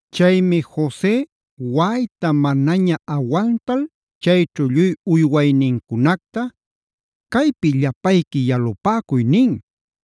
Chaymi Jose waꞌayta manaña awantal chayćhu lluy uywaynincunacta: “Caypi llapayqui yalupäcuy” nin.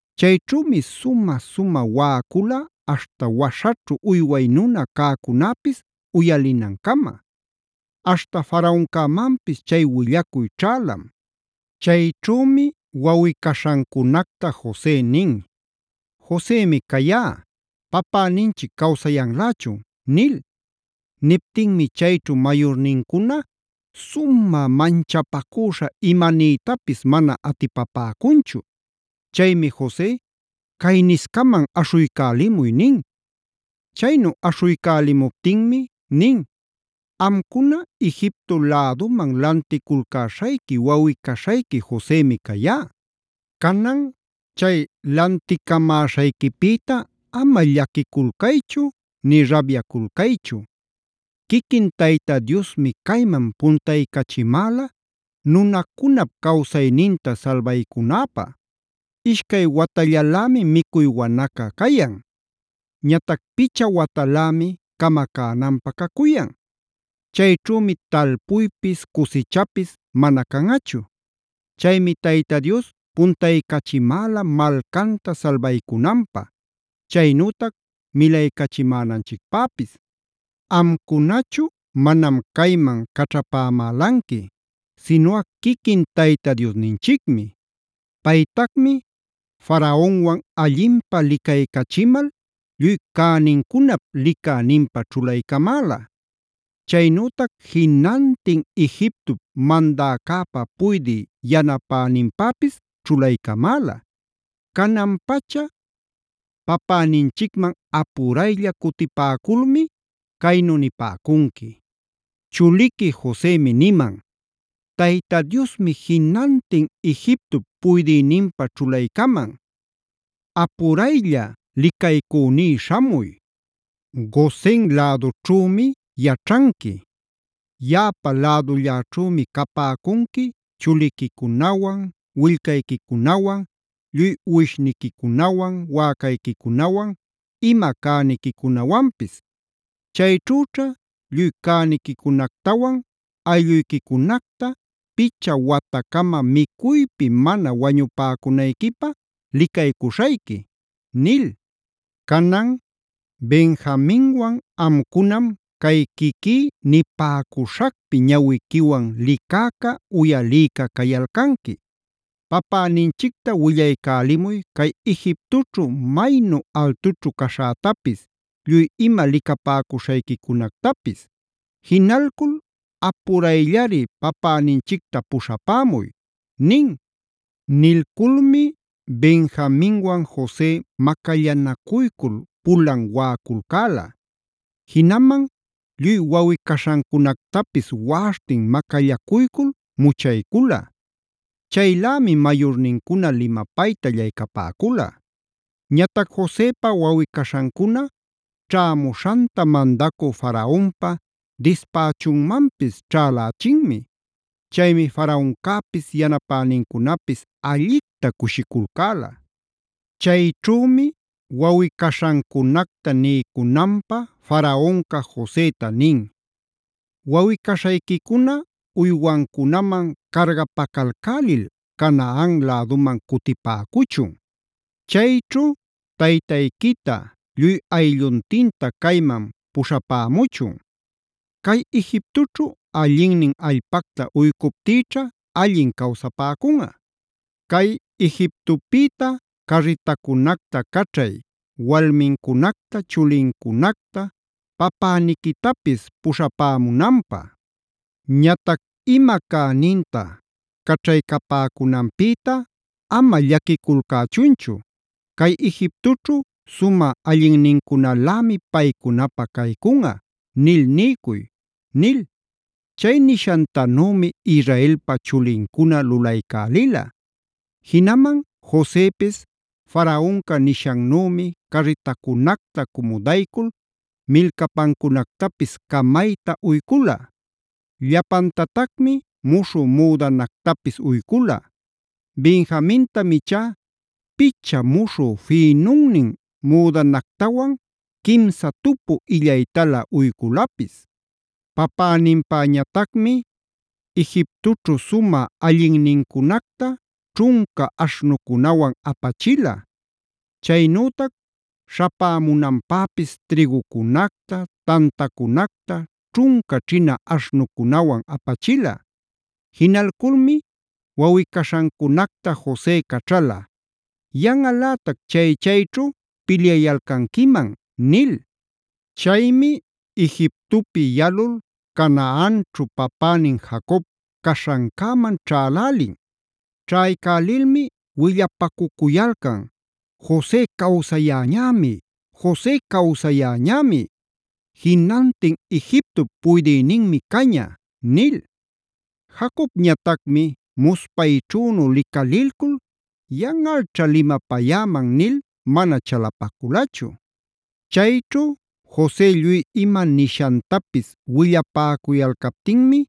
Chayćhümi sumä-sumä waꞌacula aśhta waśhaćhu uyway nuna cäcunäpis uyalinancama. Aśhta Faraoncämanpis chay willacuy ćhälam. Chayćhümi wawꞌi-caśhancunacta Jose nin: “Josemi cayá. ¿Papäninchic cawsayanlächun?” nil. Niptinmi chayćhu mayurnincuna sumä manchapacüśha imanïtapis mana atipapäcunchu. Chaymi Jose: “Cayniscaman aśhuycälimuy” nin. Chaynu aśhuycälimuptinmi nin: “Amcuna Egipto läduman lanticulcäśhayqui wawꞌi-caśhayqui Josemi cayá. Canan chay lanticapämäśhayquipïta ama llaquiculcaychu nï rabyaculcaychu. Quiquin Tayta Diosmi cayman puntaycachimäla nunacunap cawsayninta salbaycunäpä. Ishcay watallalämi micuy wanaca cayan. Ñatac picha watalämi camacänanpä cacuyan. Chayćhümi talpuypis cusichapis mana canꞌachu. Chaymi Tayta Dios puntaycachimäla malcanta salbaycunanpä. Chaynütac milaycachimänanchicpäpis. Amcunachu manam cayman caćhapämälanqui, sinuꞌa quiquin Tayta Diosninchicmi. Paytacmi Faraonwan allinpä licaycachimal lluy cänincunap licäninpä ćhulaycamäla. Chaynütac jinantin Egiptop mandäcäpa puydï yanapäninpäpis ćhulaycamäla. Canan-pacha papäninchicman apuraylla cutipäculmi caynu nipäcunqui: ‘Chuliqui Josemi niman: “Tayta Diosmi jinantin Egiptop puydïninpä ćhulaycaman. ¡Apuraylla licaycüní śhamuy! Gosen lädućhümi yaćhanqui. Yaꞌapa lädülläćhümi capäcunqui chuliquicunawan, willcayquicunawan, lluy uwishniquicunawan, wäcayquicunawan, ima cäniquicunawanpis. Chayćhüćha lluy cäniquicunactawan aylluyquicunacta picha watacama micuypi mana wañupäcunayquipä licaycuśhayqui” nil.b Canan, Benjaminwan amcunam cay quiquí nipäcuśhacpi ñawiquiwan licäca, uyalïca cayalcanqui. Papäninchicta willaycälimuy cay Egiptoćhu maynu altućhu caśhätapis, lluy ima licapäcuśhayquicunactapis. Jinalcul apurayllari papäninchicta puśhapämuy’” nin. Nilculmi Benjaminwan Jose macallanacuycul pulan waꞌaculcäla. Jinaman lluy wawꞌi-caśhancunactapis waꞌaśhtin macallacuycul muchaycula. Chaylämi mayurnincuna limapayta allaycapäcula. Ñatac Josepa wawꞌi-caśhancuna ćhämuśhanta mandacü Faraonpa dispächunmanpis ćhälächinmi. Chaymi Faraoncäpis yanapänincunapis allicta cushiculcäla. Chayćhümi wawꞌi-caśhancunacta niycunanpä Faraonca Joseta nin: “Wawꞌi-caśhayquicuna uywancunaman cargapacalcälil Canaan läduman cutipäcuchun. Chayćhu taytayquita lluy aylluntinta cayman puśhapämuchun. Cay Egiptoćhu allinnin allpacta uycuptïćha allin cawsapäcunꞌa. Cay Egiptopïta carritacunacta caćhay walmincunacta, chulincunacta, papäniquitapis puśhapämunanpä. Ñatac ima cäninta caćhaycapämunanpïta ama llaquiculcächunchu. Cay Egiptoćhu sumä allinnincunalämi paycunapä caycunꞌa nil niycuy” nil. Chay nishantanümi Israelpa chulincuna lulaycälila. Jinaman Josepis Faraonca nishannümi carritacunacta cumudaycul milcapancunactapis camayta uycula. Llapantatacmi muśhü müdanactapis uycula. Benjamintam ichá picha muśhü fïnunnin müdanactawan quimsa tupu illaytalä uyculapis. Papäninpäñatacmi: Egiptoćhu sumä allinnincunacta ćhunca aśhnucunawan apachila. Chaynütac śhapämunanpäpis trïgucunacta, tantacunacta ćhunca ćhina aśhnucunawan apachila. Jinalculmi wawꞌi-caśhancunacta Jose caćhala: “Yanꞌalätac chaychayćhu pilyayalcanquiman” nil. Chaymi Egiptopi yalul Canaanćhu papänin Jacob caśhancäman ćhälälin. Ćhaycälilmi willapacucuyalcan: “¡Jose cawsayäñämi! ¡Jose cawsayäñämi! ¡Jinantin Egiptop puydïninmi caña!” nil. Jacobñatacmi muspayćhünu licalilcul “yanꞌalćha limapayäman” nil mana chalapaculachu. Chayćhu Jose lluy ima nishantapis willapäcuyalcaptinmi,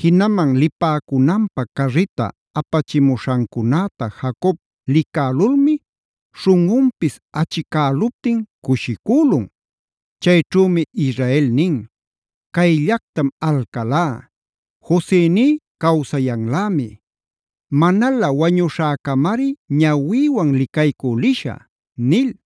jinaman lipäcunanpä carrita apachimuśhancunäta Jacob licälulmi śhunꞌunpis achicäluptin cushicülun. Chayćhümi Israel nin: “¡Cayllactam alcalá! ¡Josení cawsayanlämi! Manalä wañuśhäcamari ñawïwan licaycü lishä” nil.